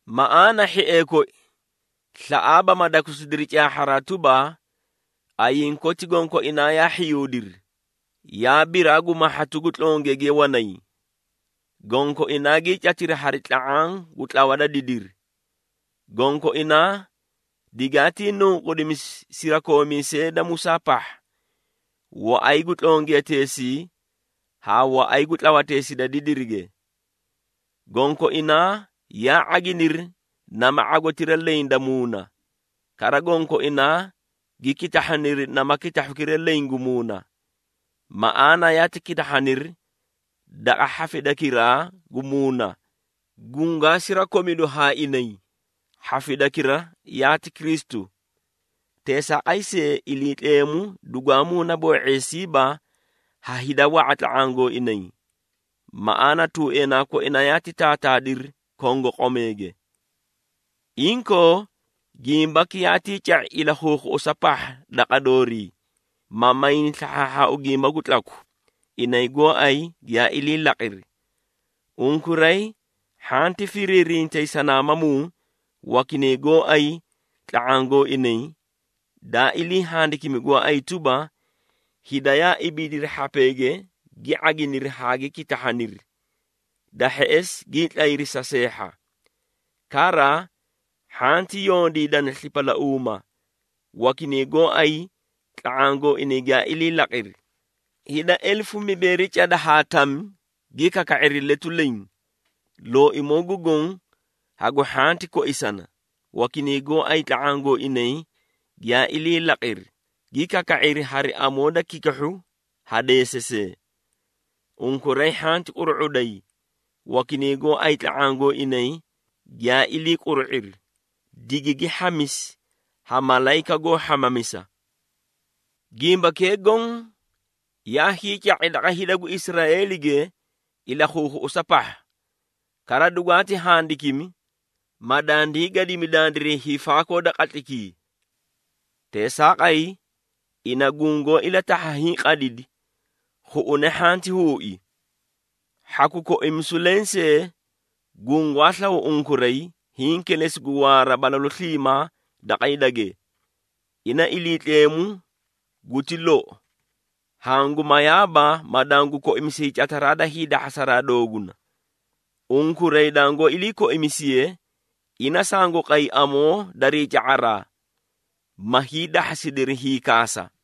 Maꞌaana hhiee koi, slaꞌaaba ma dakusidiri caahharaa tuba, ayiĩ koti gonkoinaa yaa hhiyuudiri, yaa biraa gu mahhatu gu tlongiyage wanay. Gonkoinaa gii catiri hari tla⁄aã gu tlawa da didiri. Gonkoinaa digaatii nunqudimisi sirakoomiisee da Musaa pahha, waꞌay gu tlongiyateesii haa waꞌay gu tlawateesii da didirige. Gonkoinaa yaa ⁄aginiri nama ⁄agotira leẽ da muuna, kara gonkoinaa gi kitahhaniri nama kitahhukira leẽ gu muuna. Maꞌaana yaati kitahhaniri daqa hhafidakiraa gu muuna, gungaa sirakomidu haa inay, hhafidakira yaati Kristu. Teesaaqay see, Iliitleemu dugwaa muunaboo⁄eesiiba ha hida wa⁄a tla⁄aã gooinay. Maꞌaana, tuueenaa koina yaati taataadiri kongoqomeege. Inkoo, gimbaki yaatii ca⁄i ilakhuukhuꞌusa pahha daqa doorii, ma mayni slahhaahhaau gimba gu tlaku, inay gooay giyaa ilii laqiri. Unkuray hhanti firiirintay sanaamamuu, wakinay gooay tla⁄aã gooinay, daa ilii handikimi gooay tuba, “Hida yaa ibiidiri hhapeege gi ⁄aginiri haa gi kitahhaniri, da hheꞌesi gii tlayri sa seehha.” Kara, hhanti yondiidana slipalauuma, wakinay gooay tla⁄aã gooinay giyaa ilii laqiri, hida elefu mibeeri cada haa tami gi kaka⁄iri letu leẽ. Looimoo gu Goõ hagu hhanti koisana, wakinay gooay tla⁄aã gooinay giyaa ilii laqiri, gi kaka⁄iri hari amoo da kikihhu ha deesasee. Unkuray hhanti quru⁄uday, wakinay gooay tla⁄aã gooinay giyaa ilii quru⁄iri, digigi hhamisi ha malayika goó hhamamisa. Gimbakee goõ yaa hiica⁄i daqa hida gu Israeelige ilakhuukhuꞌusa pahha. Kara dugwaati handikimi, ma dandii gadimi dandiray hiifaakoo da qatlaykii. Teesaaqay, ina gungoó ilatahha hiĩ qadidi, khuꞌune hhanti huui. Hhaku koimisu lensee gungwaa slaw unkuray, hiĩ kilesi gu waara balalu sliimaa daqa hidage. Ina Iliitleemu guti lou, hangu mayaaba ma dangu koimisi hiicataraa da hiidahhasa dooguna. Unkuray dangoó ilii koimisiye, ina sangu qay amoo darii ca⁄araa, ma hiidahhasidiri hiikaasa.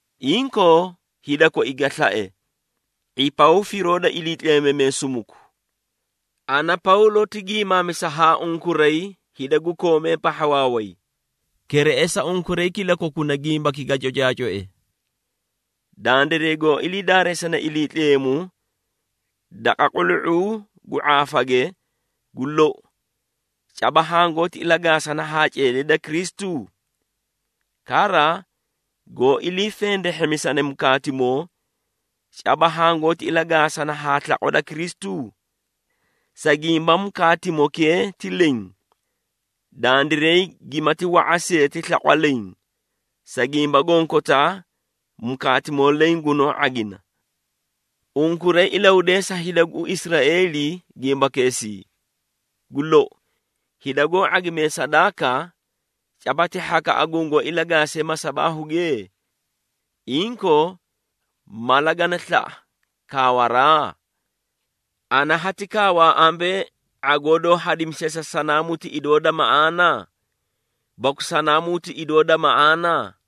Inkoo, hida koi ga slae, ⁄ipaw firoo da iliitleemamee sumuku. Ana, Pawlo ti giimaamisa haa unkuray hida gu koomee pahha waaway. Kereꞌesa unkuray kilakokuna gimbaki ga cocaacoe. Dandiray goó ilii daareesane Iliitleemu daqa qulu⁄uu gu ⁄aafage, gu lou caba hangoóti ilagaasana haa ceedee da Kristu? Kara, goó ilii fendehhemisane mukaatimoo, caba hangoóti ilagaasana haa slaqwa da Kristu? Sa gimba mukaatimokee ti leẽ, dandiray gimati wa⁄a see ti slaqwa leẽ, sa gimba gonkotaa mukaatimoo leẽ gunoó ⁄agina. Unkuray ilahudeesa hida gu Israeeli gimbakeesii. Gu lou, hida goó ⁄agimee sadaaka, caba ti hhakaꞌa gungoó ilagaasiye masabaahuge? Inkoo, mala gani slaꞌa kaawaraa? Ana hati kaawaa ambee, ⁄agoo doó hadimisiye sa sanaamuu ti idoo da maꞌaana? Baku sanaamuu ti idoo da maꞌaana?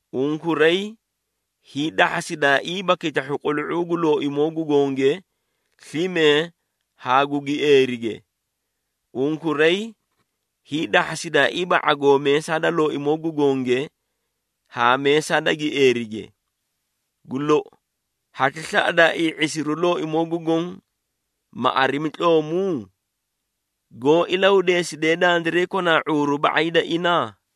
Unkuray hiidahhasidaaiiba kitahhu qulu⁄uu gu Looimoo gu Gonge slime haa gu gieerige. Unkuray hiidahhasidaaiiba ⁄agoo meesaa da Looimoo gu Gonge haa meesaa da gieerige. Gu lou, hati slaꞌadaaii ⁄isiru Looimoo gu Goõ, ma arimi tloomu? Goó ilahudeesidee dandiray konaa ⁄uuru ba⁄ay da ina?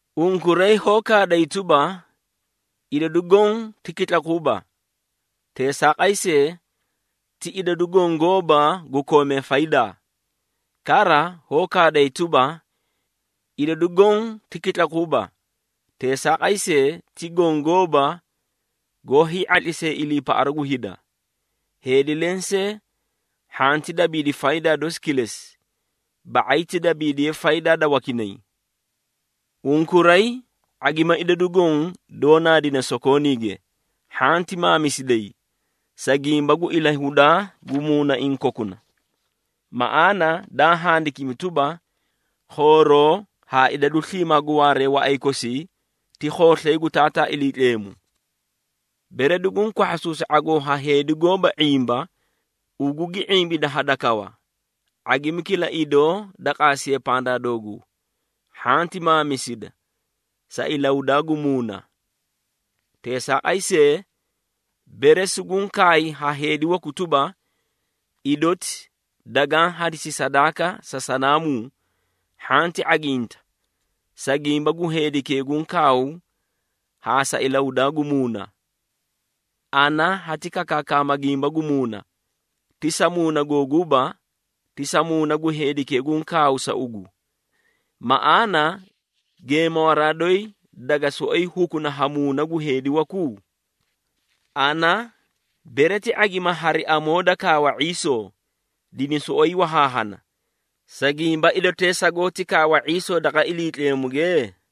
Unkuray hoó kaaday tuba, “Idadu goõ ti kitlakuuba.” Teesaaqay see, ti idadu goõ gooba gu koomee faydaa. Kara, hoó kaaday tuba, “Idadu goõ ti kitlakuuba,” Teesaaqay see, ti goõ gooba goó hii⁄atlisee iliipaꞌaru gu hida. Heedi lensee hhanti dabiidi faydaa dosi kilesi, ba⁄ay ti dabiidiye faydaa da wakinay. Unkuray ⁄agima idadu goõ doó naadine sokooniige, hhanti maamisiday, sa gimba gu ilahudaa gu muunaiĩ kokuna. Maꞌaana daa handikimi tuba, “Khooroo haa idadu sliimaa gu waaree waꞌay kosii ti khooslay gu Taataa Iliitleemu.” Bere duguũ kwahhasuusi ⁄agoo haa heedi goóba ⁄imba, ugu gi ⁄imbida hadakawa, ⁄agimi kila idoo da qaasiye pandaa dooguu, hhanti maamisida, sa ilahudaa gu muuna. Teesaaqay see, bere suguũ kaay haa heedi waku tuba, “Idoti dagaã hadisi sadaaka sa sanaamuu,” hhanti ⁄aginta, sa gimba gu heedikee guũ kaaw haa sa ilahudaa gu muuna. Ana hati kakaakama gimba gu muuna, ti sa muuna googuuba, ti sa muuna gu heedikee guũ kaaw sa ugu. Maꞌaana, geemawaraa doyi daga soꞌoyi hukuna ha muuna gu heedi waku? Ana, bere ti ⁄agima hari amoo da kaawa ⁄iisoo, dini soꞌoyi wahaahana, sa gimba idotee sagoóti kaawa ⁄iisoo daqa Iliitleemuge?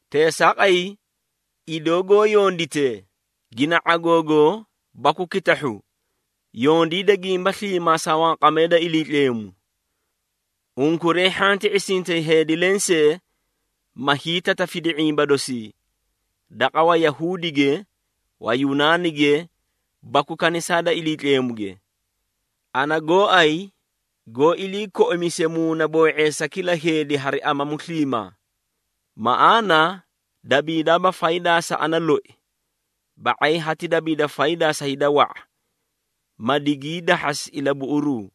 Teesaaqay, idoo goó yonditee, gina ⁄agoogoo baku kitahhu, yondiida gimba sliimaa sa wanqamee da Iliitleemu. Unkuray hhanti ⁄isintay heedi lensee, ma hiitatafidi ⁄imba dosii, daqa Wayahuudige, Wayunaanige baku kanisaa da Iliitleemuge. Ana gooay goó ilii koimise muunaboo⁄eesa kila heedi hari amamu sliimaa. Maꞌaana dabiidaaba faydaa sa ana loi, ba⁄ay hati dabiida faydaa sa hida wa⁄a, ma digii dahhasi ilabuꞌuruu.